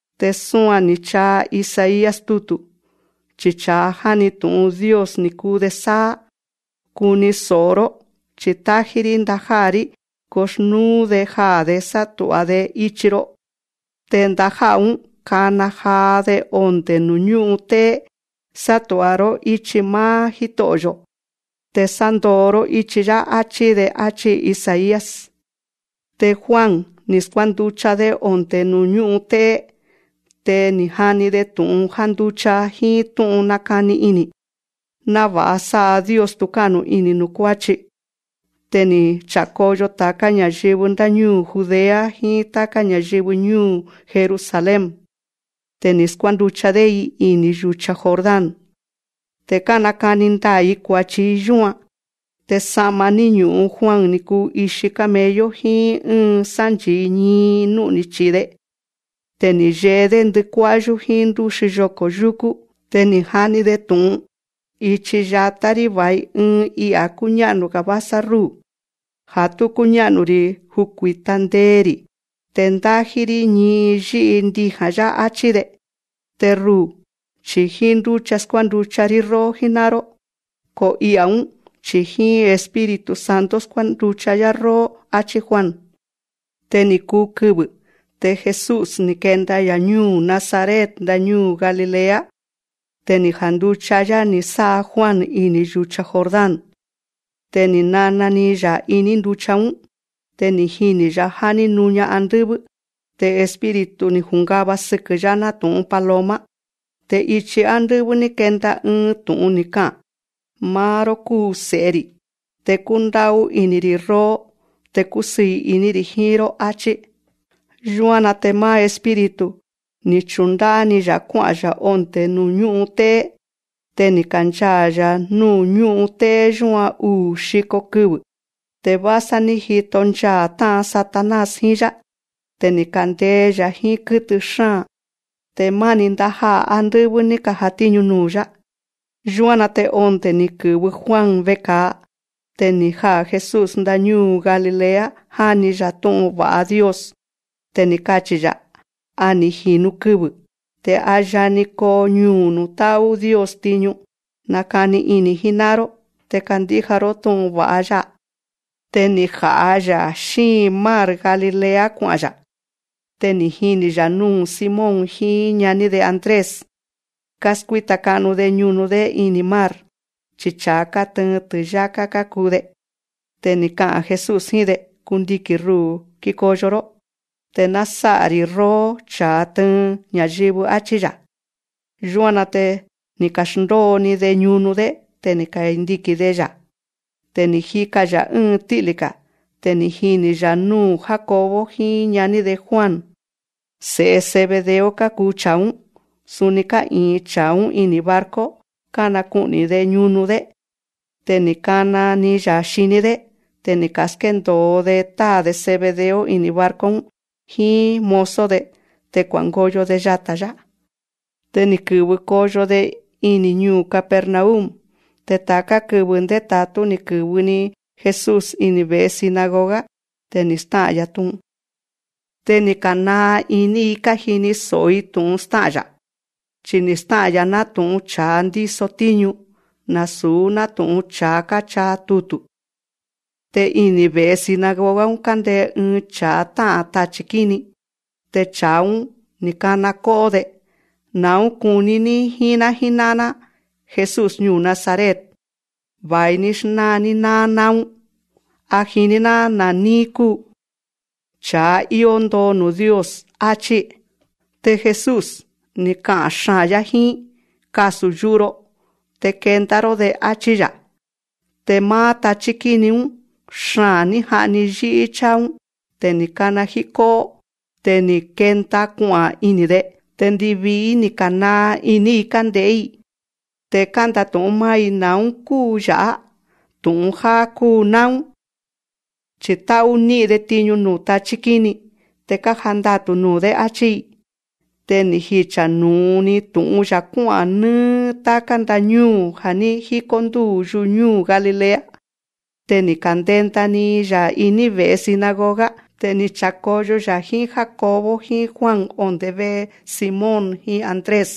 Te súan ni̱ chaa Isaías tutu̱, chi cha̱a jáni tu̱'un Dios ni̱ kuu‑de sáá: Kuni so̱'o‑ró, chi̱ tájí‑rí ndajá'a̱‑rí kuxnúú‑de jaa̱‑de sátu̱'a‑de ichi‑ro. Te ndajá'a̱‑ún, kana jaa‑de onde̱ nuu̱ ñú'un té'é: Sátu̱'a‑ró íchi máá Jíto'o̱‑yo̱ te sándóó‑ró íchi‑yá, achi̱‑de, áchí Isaías. Te Juan, ni̱ skuánducha‑dé onde̱ nuu̱ ñú'un té'é. Te ni̱ jani‑de tu̱'un jánducha jíín tú'un nakani ini̱, náva̱'a sá'a Dios tu̱ká'nu ini̱ nuu̱ kuáchi. Te ni̱ cha̱koyo ta̱ká ña̱yɨvɨ ndáñúu̱ Judea, jíín táká ña̱yɨvɨ ñúu̱ Jerusalén. Te ni̱ skuánducha‑dé‑i ini̱ yu̱cha Jordán. Te kánakani ndaa̱‑i kua̱chi‑i yúan. Te sa'ma ní ñu̱'un Juan ni̱ kuu ixi camello, jíín ɨ́ɨn sánchi̱i ñii nú'ni̱ chi̱i‑de. Te ni̱ yee‑dé ndɨkuá'yú jíín ndúxi yoko̱ yuku. Te ni̱ jani‑de tu̱'un: Ichi yatá‑rí va̱i ɨɨn I'a̱ kúñá'nu‑ga̱ vásá rúu̱, ja̱ tú kúñá'nu‑ri̱ jukui̱ta ndee‑ri̱ te ndájí‑rí ñii yí'i ndija̱n‑yá, áchí‑de. Te ruu̱, chi̱ jíín ndúcha skuánducha‑rí róó jíná'an‑ró, ko I'a̱‑ún, chi̱ jíín Espíritu Santo skuánducha‑yá róó, áchí Juan. Te ni̱ kuu kɨvɨ̱. Te Jesús, ni̱ kenda‑ya̱ ñúu̱ Nazaret ndañúu̱ Galilea. Te ni̱ janducha‑yá ni̱ sá'a Juan ini̱ yu̱cha Jordán. Te ni̱ nana‑ni‑ya̱ iní nducha‑ún. Te ni̱ jini̱‑ya̱ já ní nuña andɨ́vɨ́. Te Espíritu ni̱ jungava sɨkɨ̱‑yá nátu̱'un paloma. Te ichi ándɨ́vɨ́ ní kenda ɨɨn tu̱'un ni̱ ka'a̱n: Máá‑ró kúu Se̱'e‑ri̱, te kúndá'ú ini̱‑ri̱ róó. Te kúsɨɨ̱ iní‑ri̱ jíín‑ró. Achí. Yúan‑na te máá Espíritu, ni̱ chundá'á‑ni‑ya̱ kuá'a̱n‑ya̱ ondé ñu'un té'é. Te ni̱ kanchaa̱‑ya̱ núu̱ ñú'un té'é yúan uu̱ xiko kɨvɨ̱, te vásá ní jito nchaa̱ tá'an Satanás jíín‑yá. Te ni̱ kandee‑ya̱ jíín kɨ́tɨ xáa̱n. Te máni ndajá'a̱ ándɨ́vɨ́ ní ka̱jatíñu nuu̱‑yá. Yúan‑na te onde̱ ni̱ kɨ̱vɨ Juan veka̱a, te ni̱ jaa̱ Jesús ndañúu̱ Galilea, jáni‑ya̱ tú'un va̱'a Dios. Te ni̱ kachi̱‑ya̱: A ni̱ ji̱nu kɨvɨ̱, te a yani koo ñuu̱ nuu̱ tá'ú Dios tiñu. Nakani ini̱ jíná'an‑ró, te kandíja‑ró tú'un va̱'a‑ya̱. Te ni̱ ja̱'a‑ya̱ xíin mar Galilea kua'a̱n‑ya̱. Te ni̱ jini̱‑ya̱ núu̱ Simón jíín ñaní‑de Andrés, káskuíta ka'nu‑de ñunu‑dé ini̱ mar, chi cha̱a kátɨɨn ti̱yáká kákuu‑de. Te ni̱ ka'a̱n Jesús jíín‑de: Kundiki̱n ruu̱ kikoyo‑ró, te ná násá'a‑ri̱ róó cha̱a tɨɨn ña̱yɨvɨ. Achí‑ya̱. Yúan‑na te ni̱ ka̱xndóo‑ni‑de ñunu‑dé. Te ni̱ kandiki̱n‑de‑ya̱. Te ni̱ jika‑ya̱ ɨ́ɨn tí'lí‑ga̱. Te ni̱ jini̱‑ya̱ núu̱ Jacobo jíín ñaní‑de Juan. Se̱'e Zebedeo kákuu cha̱a‑ún. Suni ká'i̱in cha̱a‑ún ini̱ barco, kánaku'ni̱‑de ñunu‑dé. Te ni̱ kana‑ni‑ya̱ xiní‑dé. Te ni̱ ka̱skéndo̱o‑de táa̱‑de Zebedeo ini̱ barco‑ún jíín mozo‑de, te kua̱ngoyo‑de yata̱‑yá. Te ni̱ kɨ̱vɨ koyo‑de ini̱ ñuu̱ Capernaum. Te ta̱ká kɨvɨ̱ ndéta̱tú ni̱ kɨ̱vɨ‑ni Jesús ini̱ ve̱'e sinagoga, te ni̱ stá'a̱n‑ya̱ tú'un. Te ni̱ ka̱naa ini‑i kájini so̱'o‑i tu̱'un stá'a̱n‑ya̱, chi ni̱ stá'a̱n‑ya̱ nátu̱'un cha̱a ndíso tíñu, nasu̱ nátu̱'un cha̱a káchaa tutu̱. Te ini̱ ve̱'e sinagoga‑ún kándee ɨɨn cha̱a tá'a̱n tachi̱ kíni. Te cha̱a‑ún, ni̱ kana kó'ó‑de: Na̱ún kuní‑ní jíín‑ná jíná'an‑ná, Jesús ñuu̱ Nazaret. Va̱i‑ní xnáa‑ní náá náún. A jiní‑ná na̱ níí kúu, cha̱a íó ndoo nuu̱ Dios, áchí. Te Jesús, ni̱ ka'a̱n xaa̱n‑yá jíín: Kasu̱ yu'u‑ro, te kenda‑ró‑de, áchí‑ya̱. Te máá tachí kíni‑ún, xaa̱n ní ja'ni yí'í cháa‑ún. Te ni̱ kana jíkó'ó. Te ni̱ kenda kua'a̱n ini̱‑de. Te ndivii‑í ni̱ ka̱naa iní‑i kánde̱'é‑i. Te kánda̱tu̱'ún máá‑i: Na̱ún kúu ya̱'á. Tu̱'un jáá kúu náún, chi̱ tá'ú ní'in‑de tiñu nuu̱ tachí kíni, te kájandatu̱ nuu̱‑dé, áchí‑i. Te ni̱ jicha̱ nu̱u‑ni tu̱'un‑ya̱ kuá'a̱n nɨ́ɨ́ táká ndañúu̱ ja̱ ní jíkó ndúu̱ yuñúu̱ Galilea. Te ni̱ ka̱ndenda‑ni‑ya̱ iní ve̱'e sinagoga. Te ni̱ cha̱koyo‑ya̱ jíín Jacobo jíín Juan onde̱ ve'e Simón jíín Andrés.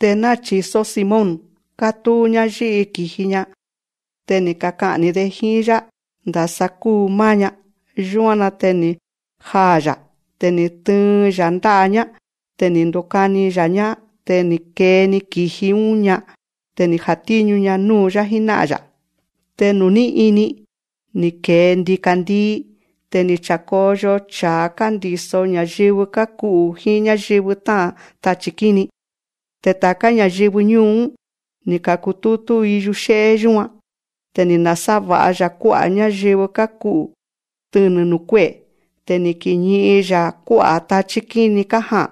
Te náchi̱só Simón, kátúu‑ñá yí'i ki̱ji‑ña. Te ni̱ kaka'a̱n‑ni‑de jíín‑yá ndasa kuu máá‑ña. Yúan‑na te ni̱ jaa̱‑ya̱. Te ni̱ tɨɨn‑ya̱ ndá'a‑ñá. Te ni̱ ndukani‑ya̱‑ñá. Te ni̱ kee‑ni ki̱ji‑ún‑ña. Te ni̱ jatíñu‑ña núu̱‑yá jíná'an‑ya̱. Te nuu̱ ní ini, ni̱ ke̱e ndika̱ndii, te ni̱ cha̱koyo cha̱a kándi̱so ña̱yɨvɨ káku'u̱, jíín ñáyɨvɨ tá'a̱n tachi̱ kíni. Te ta̱ká ña̱yɨvɨ ñúu̱‑ún, ni̱ ka̱kutútú‑i yuxé'é yúan. Te ni̱ nasáva̱'a‑ya̱ kuá'a̱ ñáyɨvɨ káku'u̱ tɨnɨ̱ nuu̱ kué'e̱. Te ni̱ kiñi'in‑ya̱ kuá'a̱ tachí kíni kája'a̱n.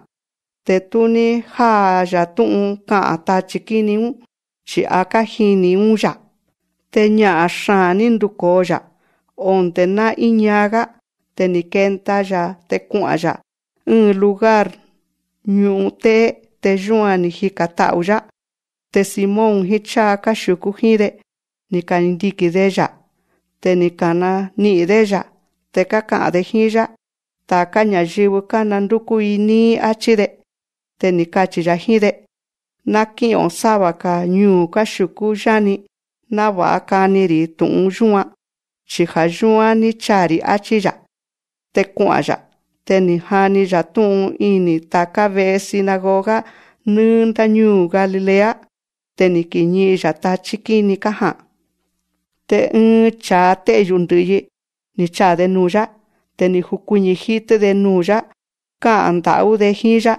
Te tú ní já'a‑ya̱ tú'un ka'a̱n tachi̱ kíni‑ún, chi̱ a kájini̱‑ún‑yá. Te ña'a̱n xaa̱n ní nduko̱o‑ya̱, onde̱ ná íñaa‑gá. Te ni̱ kenda‑ya̱ te kua'a̱n‑ya̱ ɨ́ɨn lugar ñu'un té'é. Te yúan ni̱ jika̱n ta'u̱‑yá. Te Simón jíín cháa káxiu̱kú jíín‑de, ni̱ kandiki̱n‑de‑ya̱. Te ni̱ ka̱nani'i̱n‑dé‑ya̱. Te káka'a̱n‑de jíín‑yá: Ta̱ká ña̱yɨvɨ, kánandúkú‑i níí, áchí‑de. Te ni̱ kachi̱‑ya̱ jíín‑de: Ná kí'o̱n sáva‑ga̱ ñuu̱ káxiu̱kú yáni, náva̱'a kani‑ri̱ tu̱'un yúan, chi ja̱ yúán ní chaa̱‑ri̱. Achí‑ya̱. Te kua'a̱n‑ya̱. Te ni̱ jani‑ya̱ tú'un ini̱ ta̱ká ve'e sinagoga nɨ́ɨ́ ndáñúu̱ Galilea. Te ni̱ kiñi'in‑ya̱ tachí kíni kája'a̱n. Te ɨɨn cha̱a té'yu̱ ndɨ̱'yi, ni̱ chaa̱‑de nuu̱‑yá. Te ni̱ jukuiñi̱ jítɨ́‑de nuu̱‑yá, ká'a̱n nda̱'ú‑de jíín‑yá: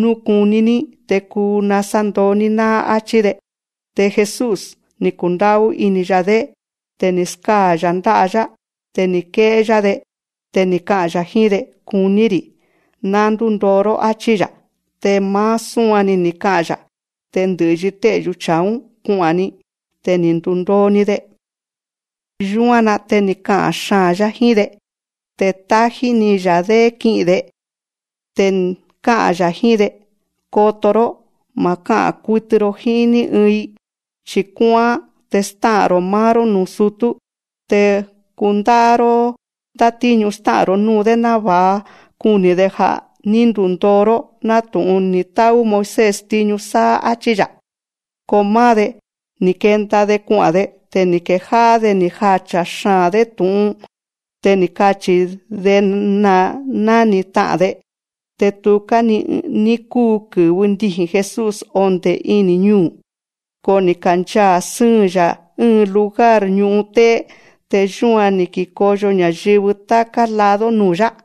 Nú kuní‑ní, te kuu nasándoo‑ní náá, áchí‑de. Te Jesús, ni̱ kundá'ú ini̱‑ya̱‑dé. Te ni̱ skáa̱‑ya̱ ndá'a‑yá. Te ni̱ ké'é‑yá‑de. Te ni̱ ka'a̱n‑ya̱ jíín‑de: Kuní‑ri̱. Ná ndúndoo‑ró. Achí‑ya̱. Te máá súan‑ni ni̱ ka'a̱n‑ya̱, te ndɨ̱'yi té'yu̱ cha̱a‑ún, kua'a̱n‑ni. Te ni̱ ndundoo‑ni‑de. Yúan‑na te ni̱ ka'a̱n xaa̱n‑yá jíín‑de. Te tájí‑ni‑ya̱‑dé ki'i̱n‑de. Te ká'a̱n‑ya̱ jíín‑de: Koto‑ró, ma̱ ká'a̱n kutɨ‑ro jíín ní ɨɨn‑i, chi̱ kuá'án, te stá'a̱n‑ro̱ máá‑ró núu̱ sutú. Te kundá'á‑ró ndátíñu stá'a̱n‑ro̱ núu̱‑dé, náva̱'a kuni̱‑de ja̱ ní ndundoo‑ró, nátu̱'un ni̱ tá'ú Moisés tiñu sáá, áchí‑ya̱. Ko máá‑de, ni̱ kenda‑de kua'a̱n‑de. Te ni̱ kejá'á‑de ni̱ jacha̱ xaa̱n‑dé tu̱'un. Te ni̱ kachi̱‑de ná ni̱ ta'a̱n‑de. Te tuká‑ni ní kúu kɨ̱vɨ ndiji̱n Jesús onde̱ ini̱ ñuu̱, ko ni̱ kanchaa̱ sɨ́ɨn‑ya̱ ɨ́ɨn lugar ñu'un té'é. Te yúan ni̱ kikoyo ña̱yɨvɨ táká lado nuu̱‑yá.